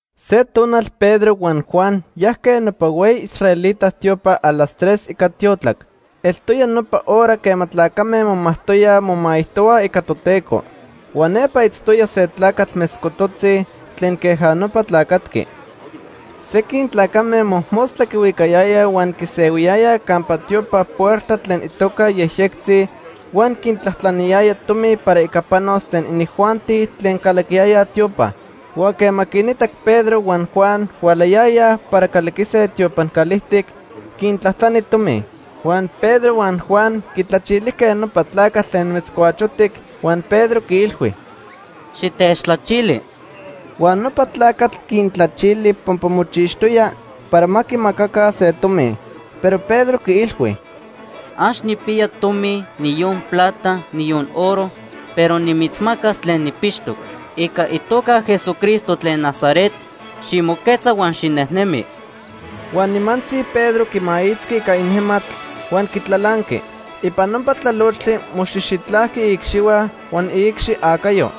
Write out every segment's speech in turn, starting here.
Se tonal Pedro huan Juan yajque nopa hueyi israelita tiopa a las tres ica tiotlac. Eltoya nopa hora quema tlacame momajtoyaj momaijtohuaj ica Toteco. Huan nepa itztoya se tlacatl metzcototzi tlen queja nopa tlacatqui. Sequin tlacame mojmostla quihuicayayaj huan quisehuiyayaj campa tiopan puerta tlen itoca Yejyectzi huan quintlajtlaniyaya tomi para ica panos tlen inijuanti tlen calaquiyayaj tiopa. Huan quema quinitac Pedro huan Juan hualayayaj para calaquise tiopan calijtic, quintlajtlani tomi. Huan Pedro huan Juan quitlachilijque nopa tlacatl tlen metzcuachotic huan Pedro quiilhui: ―Xitechtlachili. Huan nopa tlacatl quintlachili pampa mochixtoya para ma quimacaca se tomi. Pero Pedro quiilhui: ―Ax nijpiya tomi, niyon plata, niyon oro, pero nimitzmacas tlen nijpixtoc. Ica itoca Jesucristo tlen Nazaret, ximoquetza huan xinejnemi. Huan nimantzi Pedro quimaitzqui ica inejmatl huan quitlalanqui. Ipan nopa tlalochtli moxijxitlajqui iicxihua huan iicxi acayo.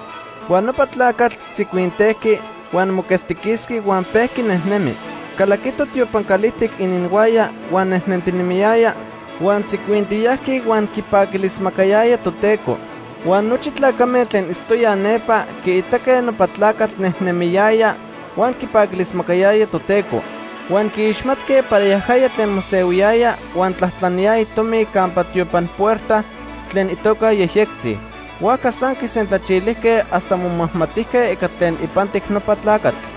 Huan nopa tlacatl tzicuintejqui, huan moquetztiquisqui huan pejqui nejnemi. Calaquito tiopan calijtic ininhuaya, huan nejnentinemiyaya, huan tzicuintiyajqui huan quipaquilismacayaya Toteco. Huan nochi tlacame tlen itztoyaj nepa quiitaque nopa tlacatl nejnemiyaya huan quipaquilismacayaya Toteco. Huan quiixmatque para yajaya tlen mosehuiyaya huan tlajtlaniyaya tomi campa tiopan puerta tlen itoca Yejyectzi. Huajca san quisentlachilijque hasta momajmatijque ica tlen ipantic nopa tlacatl.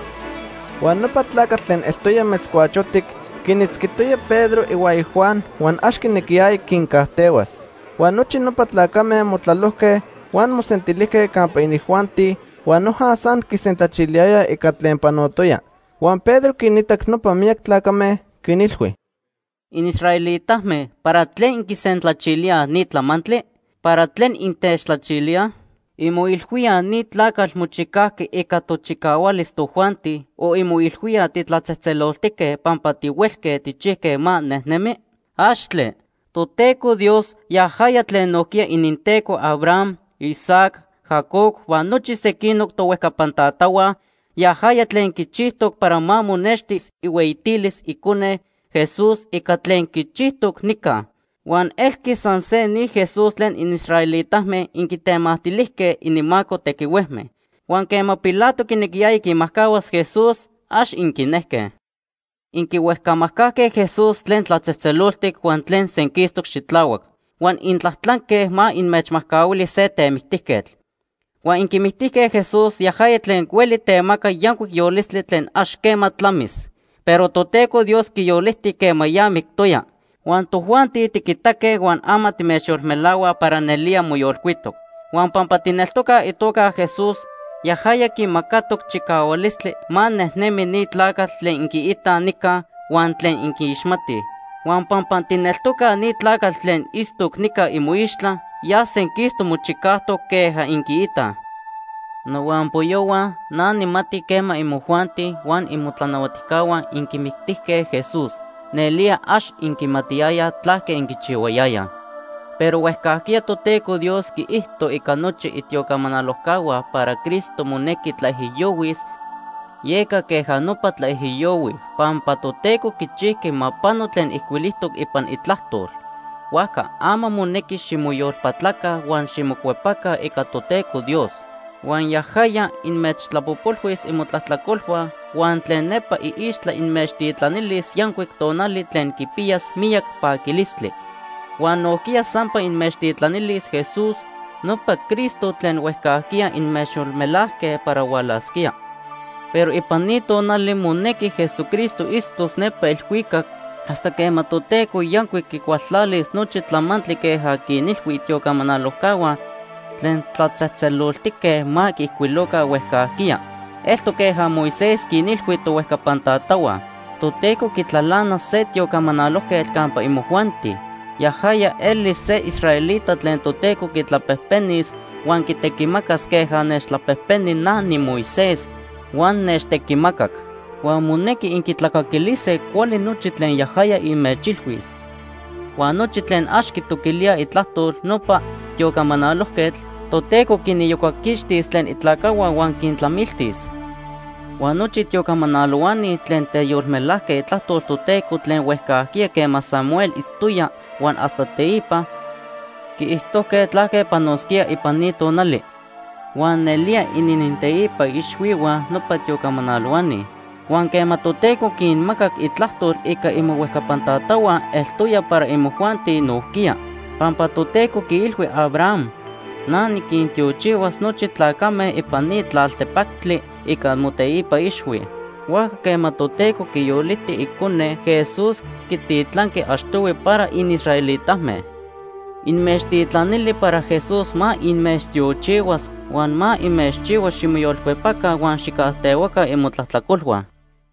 Huan nopa tlacatl tlen eltoya metzcuachotic quinitzquitoya Pedro ihuaya Juan huan ax quinequiyaya quincajtehuas. Huan nochi nopa tlacame motlalojque, huan mosentilijque campa inijuanti huan noja san quisentlachiliyayaj ica tlen panotoya. Huan Pedro quinitac nopa miyac tlacame, quinilhui: “Inisraelitame, ¿para tlen inquisentlachilíaj ni tlamantli? ¿Para tlen intechtlachilíaj? ¿Inmoilhuíaj ni tlacatl mochicajqui ica tochicahualis tojuanti o inmoilhuíaj titlatzejtzeloltique pampa tihuelque tijchijque ma nejnemi? ¡Axtle! Toteco Dios, yajaya tlen nojquiya ininTeco Abraham, Isaac, Jacob huan nochi sequinoc tohuejcapan tatahua, yajaya tlen quichijtoc para ma monextis ihueyitilis Icone, Jesús, ica tlen quichijtoc nica. Huan elqui san se ni Jesús tlen inisraelitame inquitemactilijque ininmaco tequihuejme. Huan quema Pilato quinequiyaya quimajcahuas Jesús, ax inquinejque. Inquihuejcamajcajque Jesús tlen tlatzejtzeloltic huan tlen senquistoc xitlahuac. Huan intlajtlanque ma inmechmajcahuili se temictijquetl. Huan inquimictijque Jesús, yajaya tlen hueli temaca yancuic yolistli tlen ax quema tlamis. Pero Toteco Dios quiyoliti quema ya mictoya. Huan tojuanti tiquitaque huan ama timechyolmelahuaj para nelía moyolcuitoc. Huan pampa tijneltocaj itoca Jesús, yajaya quimacatoc chicahualistli ma nejnemi ni tlacatl tlen inquiitaj nica huan tlen inquiixmatij. Huan pampa tijneltocaj, ni tlacatl tlen itztoc nica imoixtla ya senquistoc mochicajtoc queja inquiitaj. “Nohuampoyohua, na nijmati quema imojuanti huan imotlanahuatijcahua inquimictijque Jesús, nelía ax inquimatiyayaj tlaque inquichihuayayaj. Pero huejcajquiya Toteco Dios quiijto ica nochi itiocamanalojcahua para Cristo monequi tlaijiyohuis, yeca queja nopa tlaijiyohui, pampa Toteco quichijqui ma pano tlen ijcuilijtoc ipan Itlajtol. Huajca ama monequi ximoyolpatlaca huan ximocuepaca ica Toteco Dios. Huan yajaya inmechtlapojpolhuis imotlajtlacolhua huan tlen nepa iixtla inmechtitlanilis yancuic tonali tlen quipiyas miyac paquilistli. Huan nojquiya sampa inmechtitlanilis Jesús, nopa Cristo tlen huejcajquiya inmechyolmelajque para hualasquía. Pero ipan ni tonali monequi Jesucristo itztos nepa elhuicac hasta quema Toteco yancuic quicualtlalis nochi tlamantli queja quinilhui itiocamanalojcahua tlen tlatzejtzeloltique ma quiijcuiloca huejcajquiya. Eltoc queja Moisés quinilhui tohuejcapan tatahua: ‘Toteco quitlalanas se tiocamanalojquetl campa imojuanti. Yajaya elis se israelita tlen Toteco quitlapejpenis huan quitequimacas queja nechtlapejpeni na niMoisés huan nechtequimacac. Huan monequi inquitlacaquilise cuali nochi tlen yajaya inmechilhuis. Huan nochi tlen ax quitoquilíaj itlajtol nopa tiocamanalojquetl, Toteco quiniyocaquixtis tlen itlacajhua huan quintlamiltis.’ “Huan nochi tiocamanalohuani tlen teyolmelajque itlajtol Toteco tlen huejcajquiya quema Samuel itztoya huan hasta teipa, quiijtojque tlaque panosquía ipan ni tonali. Huan nelía inininteipa ixhuihua nopa tiocamanalohuani. Huan quema Toteco quinmacac itlajtol ica imohuejcapan tatahua eltoya para imojuanti nojquiya. Pampa Toteco quiilhui Abraham: ‘Na niquintiochihuas nochi tlacame ipan ni tlaltepactli ica moteipa ixhui.’ Huajca quema Toteco quiyoliti Icone, Jesús, quititlanqui achtohui para inisraelitame. Inmechtitlanili para Jesús ma inmechtiochihuas huan ma inmechchihua ximoyolcuepaca huan xijcajtehuaca imotlajtlacolhua.”